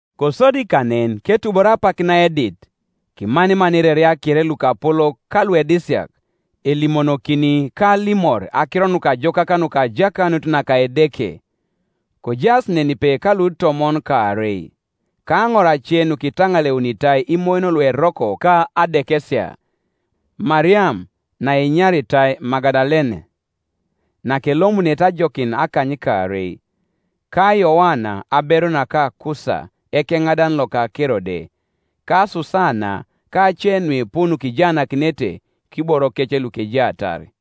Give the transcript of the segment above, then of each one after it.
Kosodi kanen ketubor apak naedit, kimaniman ireria kere lukapolok ka luedisiak, elimonokini ka alimor akiro nukajokak nuka ajakanut naka Edeke, kojaas nenipe ka lutomon kaarei, ka aŋor ace nukitaŋaleunitai imoyon lueroko ka adekesia, Mariam naenyaritai Magadalene, nakelomunete ajokin akanykaarei, ka Yoana aberu naka Kusa ekeŋadan loka Kerode, ka Susana, ka ace nuipu nukijaanakinete kiborokec lukejaatar.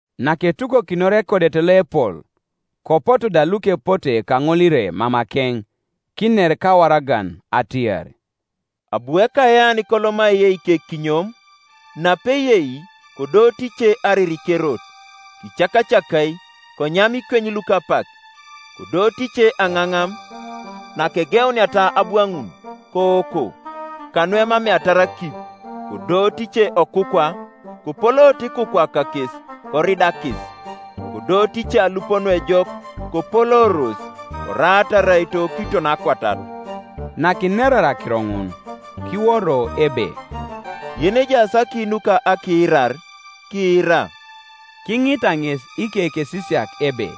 Naketukokinor ekodet loepol, kopotu da lukepote kaŋolire mamakeŋ, kiner kawaragan atiar, “Abu ekayean koloma aiye ikekinyom; napeyei, kodooto ice ariri kerot; kicakacakai, konyama ikweny luka apak. Kodooto ice aŋaŋam; nakegeuniata abwaŋun, kooko, kanuemameatar akip. Kodooto ice okukwa; kopolooto ikukwa kakes, koridakis, Kodooto ice alup nuejok, kopolooros, koraata araito kiton akwatat.” Nakinerar akiro ŋun, kiworo ebe, “Yenejaas aki nuka akiirar, kiira.” Kiŋita ŋes ikekesisiak ebe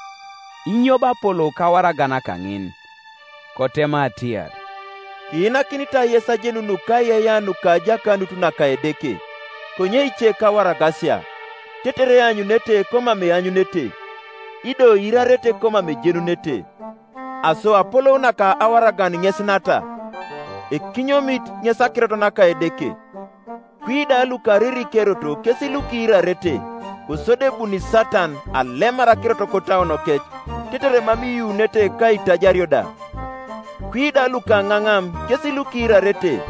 inyo bo apolou kawaragan kaŋin. Kotema atiar, “Kiinakinitai yes ajenun nukaiyeiyea nuka ajakanut naka Edeke; konye ice kawaragasia; tetere eanyunete komam eanyunete, ido iirarete komam ejenunete. Aso apolou naka awaragan ŋes nata: Ekinyomit ŋes akirot naka Edeke. Kwi da lukariri kerot kes lukiirarete; kosodi ebuni Satan, alemar akirot kotauonokec, tetere mam iyuunete ka aitajario da. Kwi da lukaŋaŋam kes lukiirarete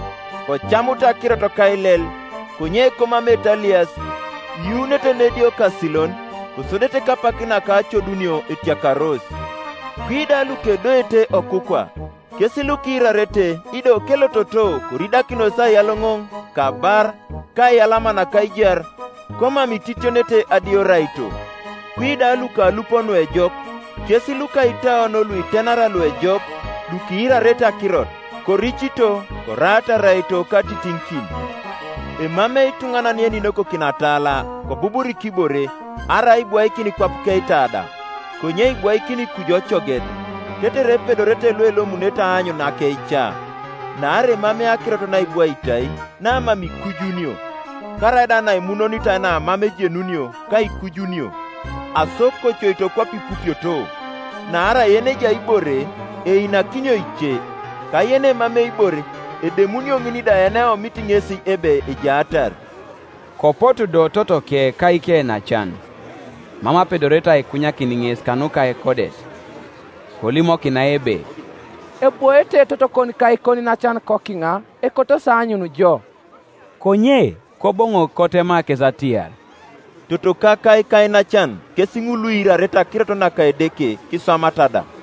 kocamut akirot kailel; konye komameete alias, iyuunete nediokasilon, kosodete kapak naka acodunio etiakaros, Kwi da lukedoete okukwa, kes lukiirarete, ido kelototo koridakinos aiyaloŋoŋ, ka abar, ka aiyalama naka aijar, komam ititionete adioraito. Kwi da luka alup nuejok, kes luka itauon luitenara luejok lukiirarete akirot, koricito, koraata araito katitiŋikin. “Emamei ituŋanan yeninokokini atala, kobuburik ibore, arai aibwaikin kwap keitada; konye ibwaikini kuju ocoget, tetere epedorete luelomunete aanyun akeija. Naarai emamei akirot naibwaitai, namam ikujunio, karaida naimunonitai namam ejenunio ka aikujunio. Aso kocoito kwape ipupioto; naarai yenejai ibore, einakinio ice; ka yenemamei ibore, edemunio ŋin da yeneomit ŋesi ebe ejaatar.” Kopotu do totoke ka ikeinacan, mam apedorete aikunyakin ŋes kanuka ekodet. Kolimokinai ebe, “Ebwoete totokon ka ikoniinacan kokiŋa; ekotosi aanyun jo.” Konye Koboŋok kotema kes atiar, “Totoka ka ikainacan kes ŋul luiirarete akirot naka Edeke, kiswamata da.”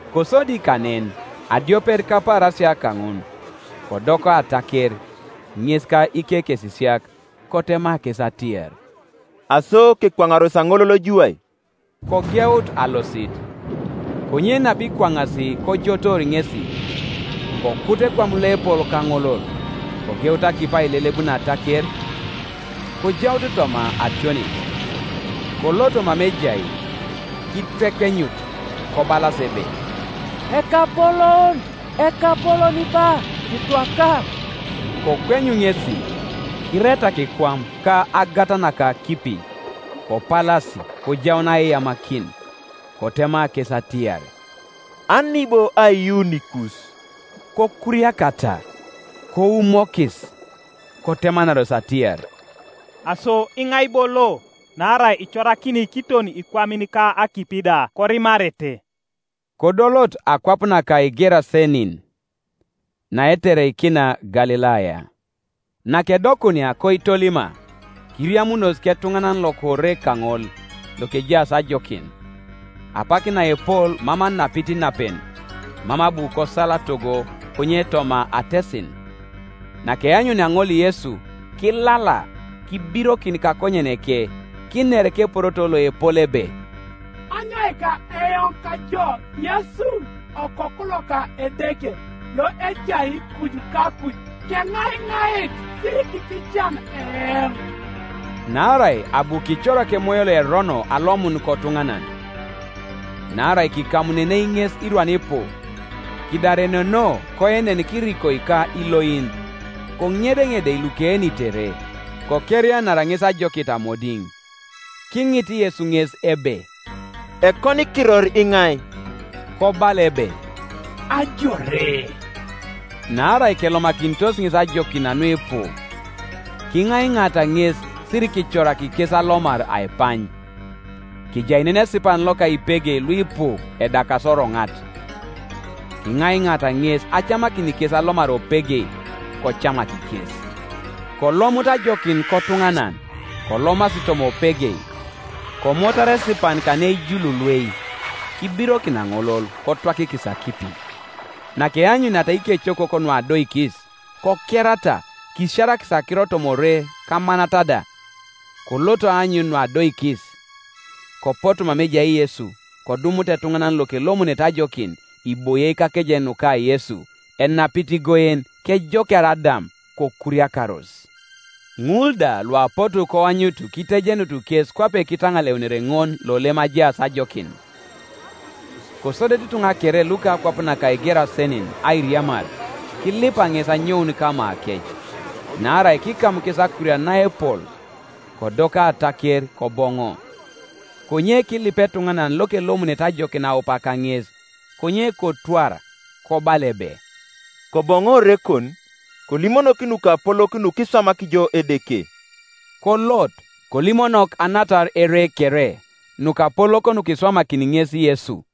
Kosodi kanen adiopet kapaarasia kaŋun, kodoka ataker, ŋes ka ikekesisiak; kotema kes atiar, “Aso kekwaŋaros aŋolol juwai”; kogeut alosit. Konye napikwaŋasi kojotoor ŋesi, kokut ekwam loepol kaŋolol; kogeut akipi ailelebun ataker, kojaut toma ationis. Koloto mama ejai kitwekenyut, kobalas ebe, “Ekapolon, ekapolon ba, kitwaka.” Kokweny ŋesi, kiretak ekwam ka agat naka akipi: kopalasi kojaun aiyamakin. Kotema kes atiar, “Ani bo aiyuunikus?” Kokuriakata, koumokis, kotemanaros atiar, “Aso iŋai bo lo, naarai icorakini kiton ikwamin ka akipi da, korimarete?” Kodolot akwap naka Igerasenin, naetereikina Galilaya, Nakedokunia koitolima, kiriamunos ketuŋanan loka ore kaŋol lokejaas ajokin; apak naepol mam anapit inapen, mam abu kosal togo, konye toma atesin, Nakeanyunia ŋol Yesu, kilala, kibirokin kakonyeneke, kiner keporoto loepol ebe, “Anyoika eoŋ kajo, Yesu, Osoku loka Edeke loejai kuju kakuj? Keŋaiŋait, sirikiitican eoŋ.” Naarai abu kicorak emoyo loerono alomun kotuŋanan. (Naarai kikamununei ŋes irwan ipu; kidareneno, koenen kirikoi ka iloin; koŋedeŋedei lukeenitere; kokerianara ŋes ajokit amodiŋ.) Kiŋit Yesu ŋes ebe, “Ekonikiror iŋai?” Kobala ebe, “Ajore,” naarai kelomakinitos ŋes ajokin nuipu. Kiŋaiŋaata ŋes sirikicorak kes alomar aipany. Kejai nen esipan loka ipegei luipu edakasi oroŋat; kiŋaiŋaata ŋes acamakin kes alomar opegei. Kocamak kes, Kolomut ajokin kotuŋanan, kolomasi toma opegei: komotar esipan kaneijululuei, kibirokin aŋolol, kotwakikis akipi. Nakeanyuniata ikecokok nuadoikis, kokerata, kisiarakis akiro toma ore kamanat da. Koloto aanyun nuadoikis; kopotu mama ejai Yesu, kodumut etuŋanan lokelomunete ajokin, iboie kakejen nuka Yesu, enapit igoen, kejokiar adam; kokuriakaros. Ŋul da luapotu koanyut kitejenut kes kwape kitaŋaleunere ŋol lolem ajaas ajokin, Kosodete ituŋa kere luka akwap naka Igerasenin airiamar kilipa ŋes anyoun kamakec; naarai kikam kes akurian naepol; kodoka ataker, koboŋo. Konye kilip etuŋanan lokelomunete ajokin aup kaŋes; konye kotwar, kobala ebe, “Koboŋo orekon, kolimonok nukapolok nukiswamak jo Edeke.” Kolot, kolimonok anatar ere kere nukapolok nukiswamakini ŋes Yesu.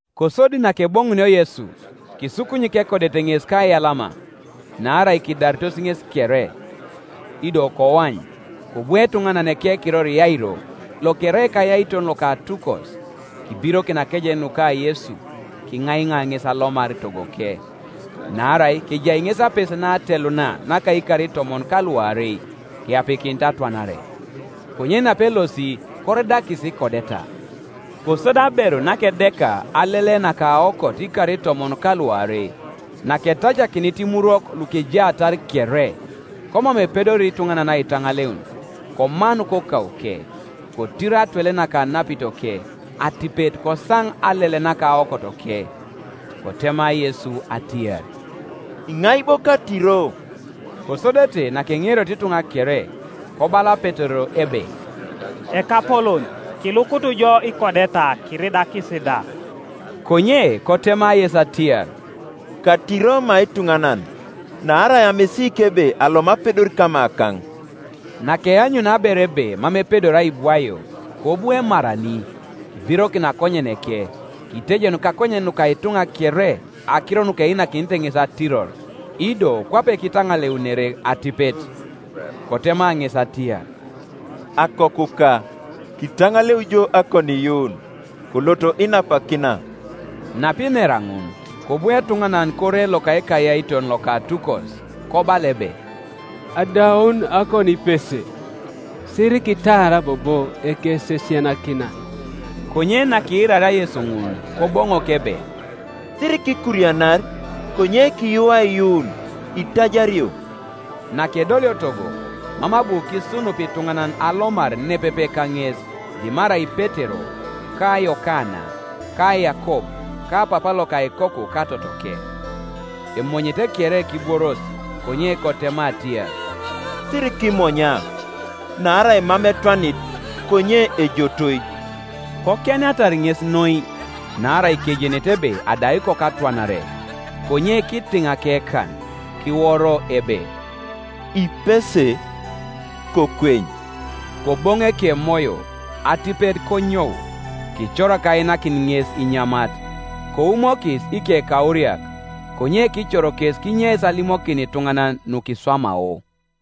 Kosodi nakeboŋunio Yesu, kisukunyik ekodet ŋes kaiyalama; naarai kidaritos ŋes kere. Ido koany, kobu etuŋanan ekekiror Yairo, lokerai ekayaiton loka atukos; kibirokin akejen nuka Yesu, kiŋaiŋa ŋes alomar togoke; Naarai kejai ŋes apese nateluna, naka ikar itomon ka luarei, keapikinit atwanare. Konye napelosi koridakis ikodeta, Kosodi aberu nakedeka alele nakaokot ikar itomon ka luarei, naketacakinit imurwok lukejaatar kere, komam epedori ituŋanan aitaŋaleun, komanu kokauke, kotiro atwele naka anapitoke; atipet kosaŋ alele nakaokotoke. Kotema Yesu atiar, “Iŋai bo katiro?” Kosodete nakeŋerioto ituŋa kere, kobala Petero ebe, “Ekapolon, kilukut jo ikodeta kiridakis da!” Konye kotema Yesu atiar, “Katiro ma ituŋanan: naarai amisiik ebe alom apedor kamakaŋ.” Nakeanyunia aberu ebe mam epedori aibwaio, kobu emarani, kibirokin akonyeneke, kitejenu kakonyen nuka ituŋa kere akiro nukeinakinete ŋes atiror, ido kwape kitaŋaleunere atipet. Kotema ŋes atiar, “Akokuka, kitaŋaleu jo akoniiyuun; kolot inapakina.” Napinera ŋun, kobu etuŋanan kore loka ekayaiton loka atukos, kobala ebe, “Adaun akoonipese; sirikitaar bobo Ekesisianakinan.” Konye nakiiraria Yesu ŋun koboŋok ebe, “Sirikikurianar; konye kiyuu aiyuun, itajario.” Nakedolio togo, mam abu kisunup ituŋanan alomar nepepe kaŋes, dimarai Petero, ka Yokana, ka Yakob, ka papa loka ikoku ka totoke. Emonyete kere kibworos; konye kotema atiar, “Sirikimonya; naarai mam etwanit, konye ejotoi.” Kokienatar ŋes noi, naarai kejenete ebe adau ikoku atwanare. Konye kitiŋ akekan, kiworo ebe, “Ipese, kokweny.” Koboŋu ekemoyo, atipet konyou; kicorak ainakin ŋes inyamat. Koumokis ikekauriak; konye kicor kes kinyeis alimokin ituŋanan nukiswamao.